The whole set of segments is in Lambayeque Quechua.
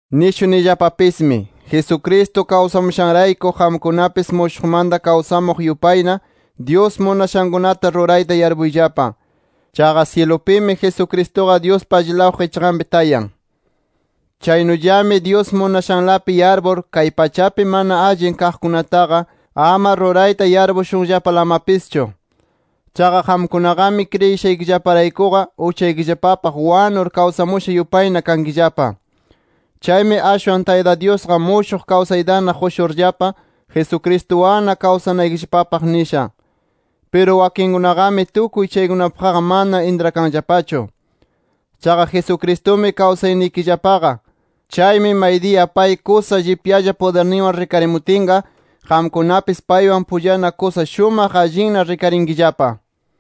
Nishunillapapismi: Jesucristo kawsamushanrayku qamkunapis mushuqmanta kawsamuq yupayna, Dyus munashankunata rurayta yarpuyllapa. Chaqa syilupimi Jesucristuqa Dyuspa allilaw qichqanpi tayan. Chaynullami Dyus munashanlapi yarpur, kay pachapi mana allin kaqkunataqa, ama rurayta yarpushunllapalamapischu. Chaqa qamkunaqami kriyishaykillaparaykuqa uchaykillapapaq wanur, kawsamusha yupayna kankillapa. Chaymi ashwan Tayta Dyusqa mushuq kawsaytana qushurllapa, Jesucristuwanna kawsanaykillapapaq nisha. Piru wakinkunaqami, tukuy chaykunapaqqa mana intrakanllapachu. Chaqa Jesucristumi kawsaynikillapaqa. Chaymi maydiya pay kusa llipyalla pudirninwan rikarimutinqa, qamkunapis paywan pullana kusa shumaq allinna rikarinkillapa.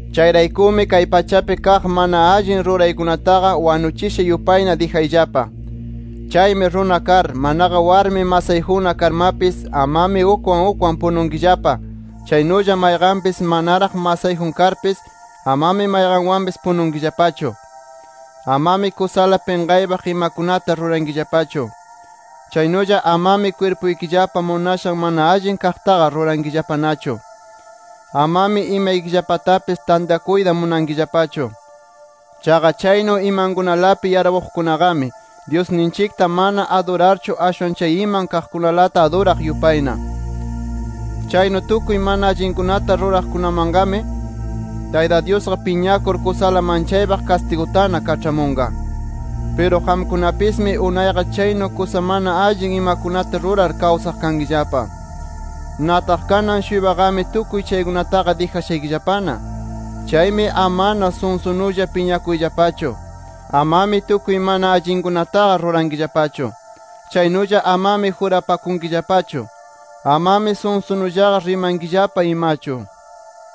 Chayraykumi kay pachapi kaq mana allin ruraykunataqa wanuchisha yupayna dijayllapa. Chaymi runa kar, manaqa warmi masayjunna karmapis amami ukwan ukwan pununkillapa. Chaynulla mayqanpis manaraq masayjun karpis amami mayqanwanpis pununkillapachu. Amami kusala pinqaypaq imakunata rurankillapachu. Chaynulla amami kwirpuykillapa munashan mana allin kaqtaqa rurankillapanachu. Amami imaykillapatapis tantakuyta munankillapachu. Chaqa chaynu imankunalapi yarpuqkunaqami, Dyusninchikta mana adurarchu, ashwan chay iman kaqkunalata aduraq yupayna. Chaynu tukuy mana allinkunata ruraqkunamanqami, Tayta Dyusqa piñakur, kusala manchaypaq kastigutana kaĉhamunqa. Piru qamkunapismi unayqa chaynu kusa mana allin imakunata rurar kawsaq kankillapa. Nataq kanan-shuypaqami tukuy chaykunataqa dijashaykillapana. Chaymi amana sunsunulla piñakuyllapachu. Amami tukuy mana allinkunataqa rurankillapachu. Chaynulla amami jurapakunkillapachu. Amami sunsunullaqa rimankillapa imachu.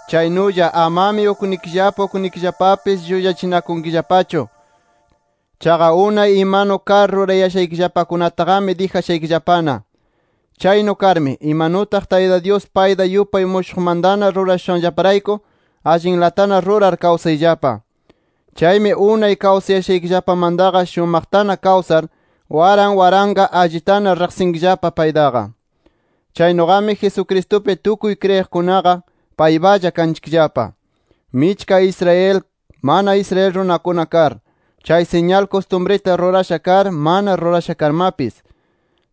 Chaynulla amami ukninchikllapa ukninchikllapapis llullachinakunkillapachu. Chaqa unay imanu kar rurayashaykillapakunataqami dijashaykillapana. Chaynu karmi, imanutaq Tayta Dyus payta yupay mushuqmantana rurashushanllaparayku, allinlatana rurar kawsayllapa. Chaymi unay kawsayashaykillapamantaqa shumaqtana kawsar, waran waranqa allitana riqsinkillapa paytaqa. Chaynuqami Jesucristupi tukuy kriyiqkunaqa paypalla kanchikllapa, michka Israel, mana Israel runakuna kar, chay siñal kustumrita rurasha kar, mana rurasha karmapis.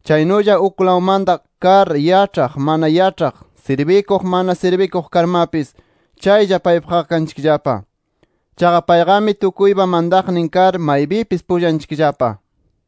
Chaynulla uklawmanta kar, yaĉhaq, mana yaĉhaq, sirbikuq, mana sirbikuq karmapis, chaylla paypaqqa kanchikllapa. Chaqa payqami tukuypa mantaqnin kar, maypipis pullanchikllapa.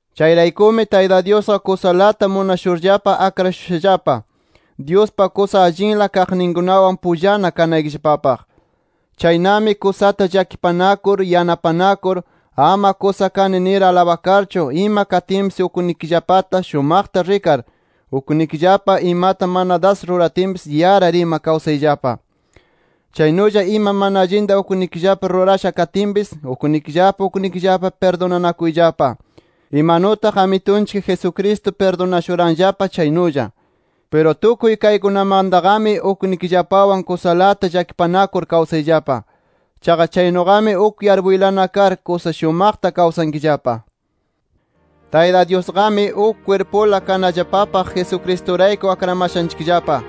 Chayraykumi Tayta Dyusqa kusalata munashurllapa, akrashushallapa, Dyuspa kusa allinla kaqninkunawan pullana kanaykillapapaq. Chaynami kusata llakipanakur, yanapanakur, ama kusa kani nir alabakarchu, ima katinpis uknikillapata shumaqta rikar, uknikillapa imata mana das ruratinpis yarar ima kawsayllapa. Chaynulla ima mana allinta uknikillapa rurasha katinpis uknikillapa uknikillapa pirdunanakuyllapa, imanutaq Amitunchik Jesucristo pirdunashuranllapa chaynulla. Piru tukuy kaykunamantaqami uknikillapawan kusalata llakipanakur kawsayllapa. Chaqa chaynuqami uk yarpuylana kar, kusa shumaqta kawsankillapa. Tayta Dyusqami, uk kwirpula kanallapapaq Jesucristurayku akramashanchikllapa.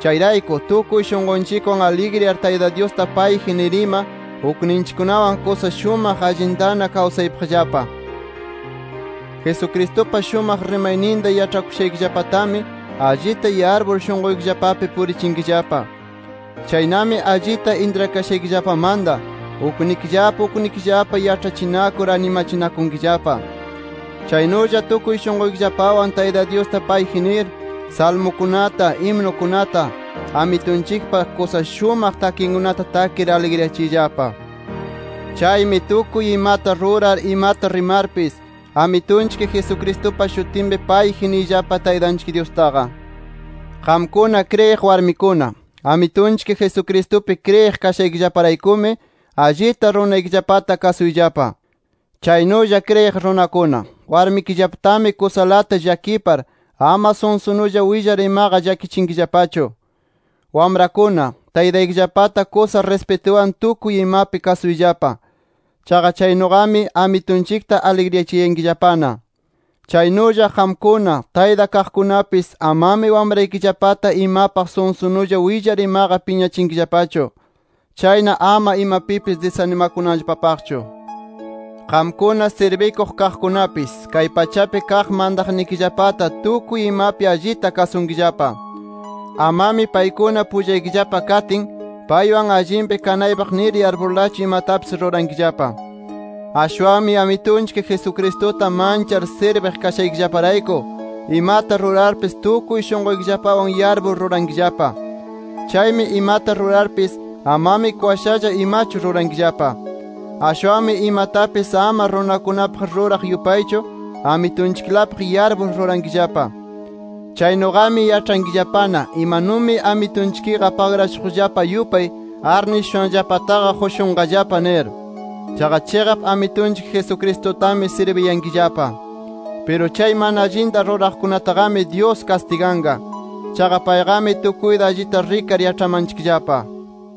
Chayrayku, tukuy shunqunchikwan aligriyar Tayta Dyusta payji nir ima, ukninchikkunawan kusa shumaq allintana kawsaypaqllapa. Jesucristupa shumaq rimayninta yaĉhakushaykillapatami allita yarpur, shunquykillapapi purichinkillapa. Chaynami allita intrakashaykillapamanta, uknikillapa uknikillapa yaĉhachinakur animachinakunkillapa. Chaynulla tukuy shunquykillapawan Tayta Dyusta payji nir, salmukunata, himnukunata, Amitunchikpa kusa shumaq takikunata takir aligriyachiyllapa. Chaymi tukuy imata rurar, imata rimarpis, Amitunchik Jesucristupa shutinpi payji niyllapa Taytanchik Dyustaqa. Qamkuna kriyiq warmikuna, Amitunchik Jesucristupi kriyiq kashaykillaparaykumi, allita runaykillapata kasuyllapa. Chaynulla kriyiq runakuna, warmikillapatami kusalata llakipar, ama sunsunulla willar imaqa llakichinkillapachu. Wamrakuna, taytaykillapata kusa rispituwan tukuy imapi kasuyllapa. Chaqa chaynuqami, Amitunchikta aligriyachiyankillapana. Chaynulla qamkuna, tayta kaqkunapis amami wamraykillapata imapaq sunsunulla willar imaqa piñachinkillapachu. Chayna ama imapipis disanimakunanllapapaqchu. Qamkuna sirbikuq kaqkunapis, kay pachapi kaq mantaqnikillapata tukuy imapi allita kasunkillapa. Amami paykuna pullaykillapa katin, paywan allinpi kanaypaq nir yarpurlachu imatapis rurankillapa. Ashwanmi Amitunchik Jesucristuta manchar sirbiq kashaykillaparayku, imata rurarpis tukuy shunquykillapawan yarpur rurankillapa. Chaymi imata rurarpis, amami kwashalla imachu rurankillapa. Ashwanmi imatapis ama runakunapaq ruraq yupaychu, Amitunchiklapaq yarpur rurankillapa. Chaynuqami yaĉhankillapana imanumi Amitunchikqa pagrashuqllapa yupay, arnishushanllapataqa qushunqallapa nir. Chaqa chiqap Amitunchik Jesucristutami sirbiyankillapa. Piru chay mana allinta ruraqkunataqami, Dyus kastiganqa. Chaqa payqami tukuyta allita rikar yaĉhamanchikllapa.